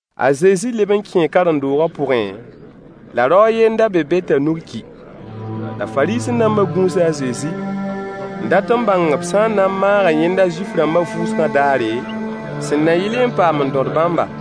A Zezi leb n kẽe karen-doogã pʋgẽ, la rao a yen n da be be t'a nug ki. La Fariisẽ-dãmbã gũusa a Zezi n dat n bãng b sã n na n maaga yẽnda Zuif-rãmbã vʋʋsgã daare, sẽn na yɩlẽ n paam n dõd bãmba.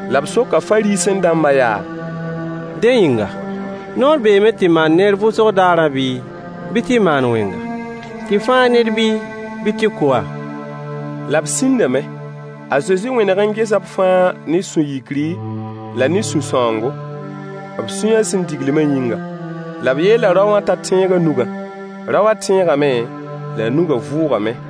La b soka Fariisẽ-dãmba yaa: Dẽ yĩnga, noor beeme tɩ maan neer vʋʋsgã daar bii, bɩ tɩ maan wẽnga? Tɩ fãag ned bii, bɩ tɩ kʋ-a? La b sĩndame. A Zezi wẽneg n gesa b fãa ne sũ-yikri la ne sũ-sãoongo, b sũyã sẽn diglmã yĩngã. La b yeela rao wã t'a tẽeg a nugã. Rao wã tẽegame la a nugã vʋʋgame.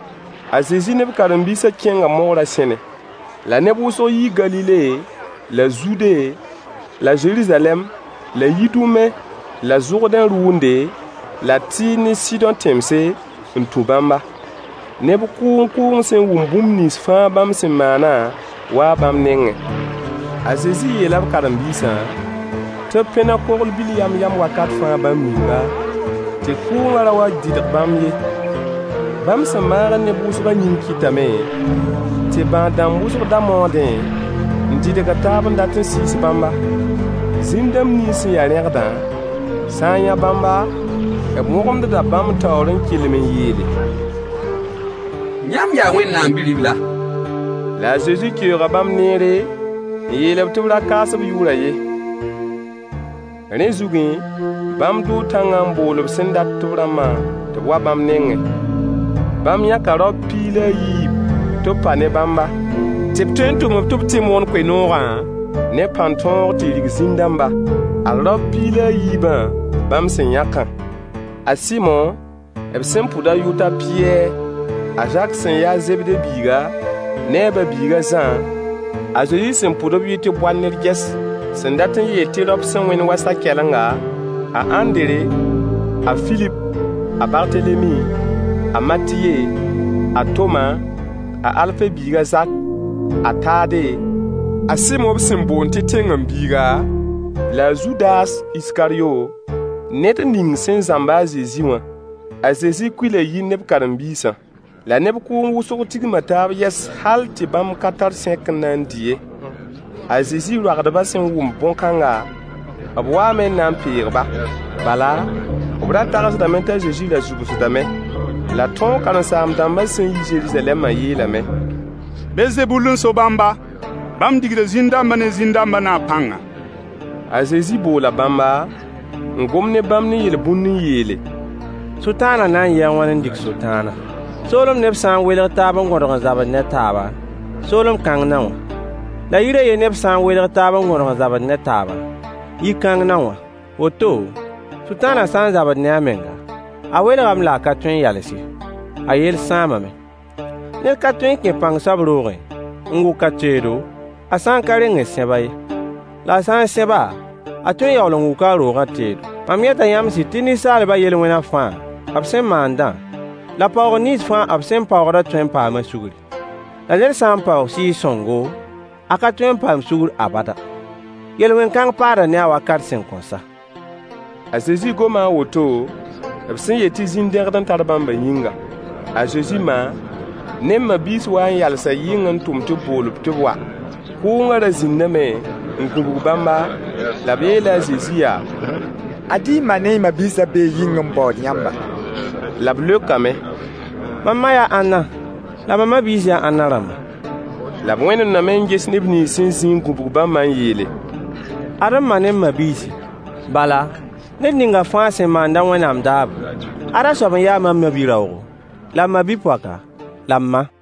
A Zezi ne b karen-biisã kẽnga mogrã sẽne. La neb wʋsg yii Galile la Zude la Zeruzalɛm la Yidume la Zʋrdẽ rʋʋnde la Tɩɩr ne Sɩdõ tẽmse n tũ bãmba. Neb kʋʋng kʋʋng sẽn wʋm bũmb nins fãa bãmb sẽn maanã waa bãmb nengẽ. A Zezi yeela b karen-biisã tɩ b pẽneg kogl-bil yam-yam wakat fãa bãmb yĩnga, tɩ kʋʋngã ra wa n dɩdg bãmb ye. Bãmb sẽn maagd neb wʋsgã yĩng kɩtame tɩ bãad-dãmb wʋsg da maoodẽ n dɩdgd taab n dat n sɩɩs bãmba. Zĩn-dãmb nins sẽn ya rẽgdã sã n yã bãmba, b wõgemdeda bãmb taoor n kelem n yeele: Yãmb yaa Wẽnnaam Bi-ribla. La a Zezi keooga bãmb neere, n yeel-b tɩ b ra kaas b yʋʋrã ye. Rẽ zugẽ, bãmb dʋʋ tãngã n bool b sẽn dat b rãmbã tɩ b wa bãmb nengẽ. Bãmb yãka raop piig la a yiib tɩ b pa ne bãmba, tɩ b tõe n tʋm-b tɩ b tɩ moon koe-noogã, ne pãn-tõog tɩ rig zĩn-dãmba. Ad raop piig la a yiibã bãmb sẽn yãkã: a Sɩmo b sẽn pʋd a yʋʋr t'a Pɩyɛɛr, a Zak sẽn ya a Zebde biiga, ne a ba-biig a Zã, a Zezi sẽn pʋd b yʋy tɩ Boanergɛs, sẽn dat n yeel tɩ raop sẽn wẽnd wa sa-kɛlenga, a Ãndre, a Filip, a Bartelemi, a Matye, a Toma, a Alfe biig a Zak, a Tade, a Sɩmo sẽn boond tɩ Zelot la a Zudas Iskaryo, ned ning sẽn zãmb-a a Zezi wã. A Zezi kuila yir ne b karen-biisã. La neb kʋʋng wʋsg tigma taab yɛs hal tɩ bãmb ka tar sẽk n na n dɩ ye. A Zezi roagdbã sẽn wʋm bõn-kãnga, b waame n na n peeg-ba, bala, b ra tagsdame t'a Zezi ra zʋbsdame. La tõog karen-saam-dãmbã sẽn yi Zeruzalɛmã yeelame: Belzebul n so bãmba. Bãmb rigda zĩn-dãmbã ne zĩn-dãmbã naab pãnga. A Zezi boola bãmba, n gom ne bãmb ne yel-bũnd n yeele: Sʋtãanã na n yɩɩ a wãn n dig sʋtãana? Soolem neb sã n welg taab n gõdg n zabd ne taaba, soolem kãng na wã. La yir a yen neb sã n welg taab n gõdg n zabd ne taaba, yi-kãng na wã. Woto, Sʋtãanã sã n zabd ne a menga, a welgame la a ka tõe n yals ye, a yell sãamame. Ned ka tõe n kẽ pãng soab roogẽ n wʋk a teedo, a sã n ka reng n sẽb-a ye. La a sã n sẽb-a, a tõe n yaool n wʋka a roogã teedo. Mam yeta yãmb sɩd tɩ ninsaalbã yel-wẽna fãa b sẽn maandã, la paoogr nins fãa b sẽn paoogdã tõe n paama sugri. La ned sã n paoog Sɩɩg-sõngo, a ka tõe n paam sugr abada. Yel-wẽn kãng paada ne-a wakat sẽn kõn sa. A Zezi goma a woto b sẽn yeel tɩ zĩn-dẽgd n tar bãmbã yĩnga. A Zezi ma ne b ma-biis waa n yalsa yɩng n tʋm tɩ b bool-b tɩ b wa. Kʋʋngã ra zĩndame n gũbg bãmba, la b yeela a Zezi yaa: Ad y ma ne y ma-biisã bee yɩng n baood yãmba. La b leokame: Mam ma yaa ãnna, la m ma-biis yaa ãnna rãmba? La b wẽnemdame n ges neb nins sẽn zĩ n gũbg bãmbã n yeele: Ad m ma ne m ma-biisi. Bala, ned ninga fãa sẽn maand-a Wẽnnaam daabo, ada soab n ya mam ma-bi-raoogo, la m ma-bi-poaka, la m ma.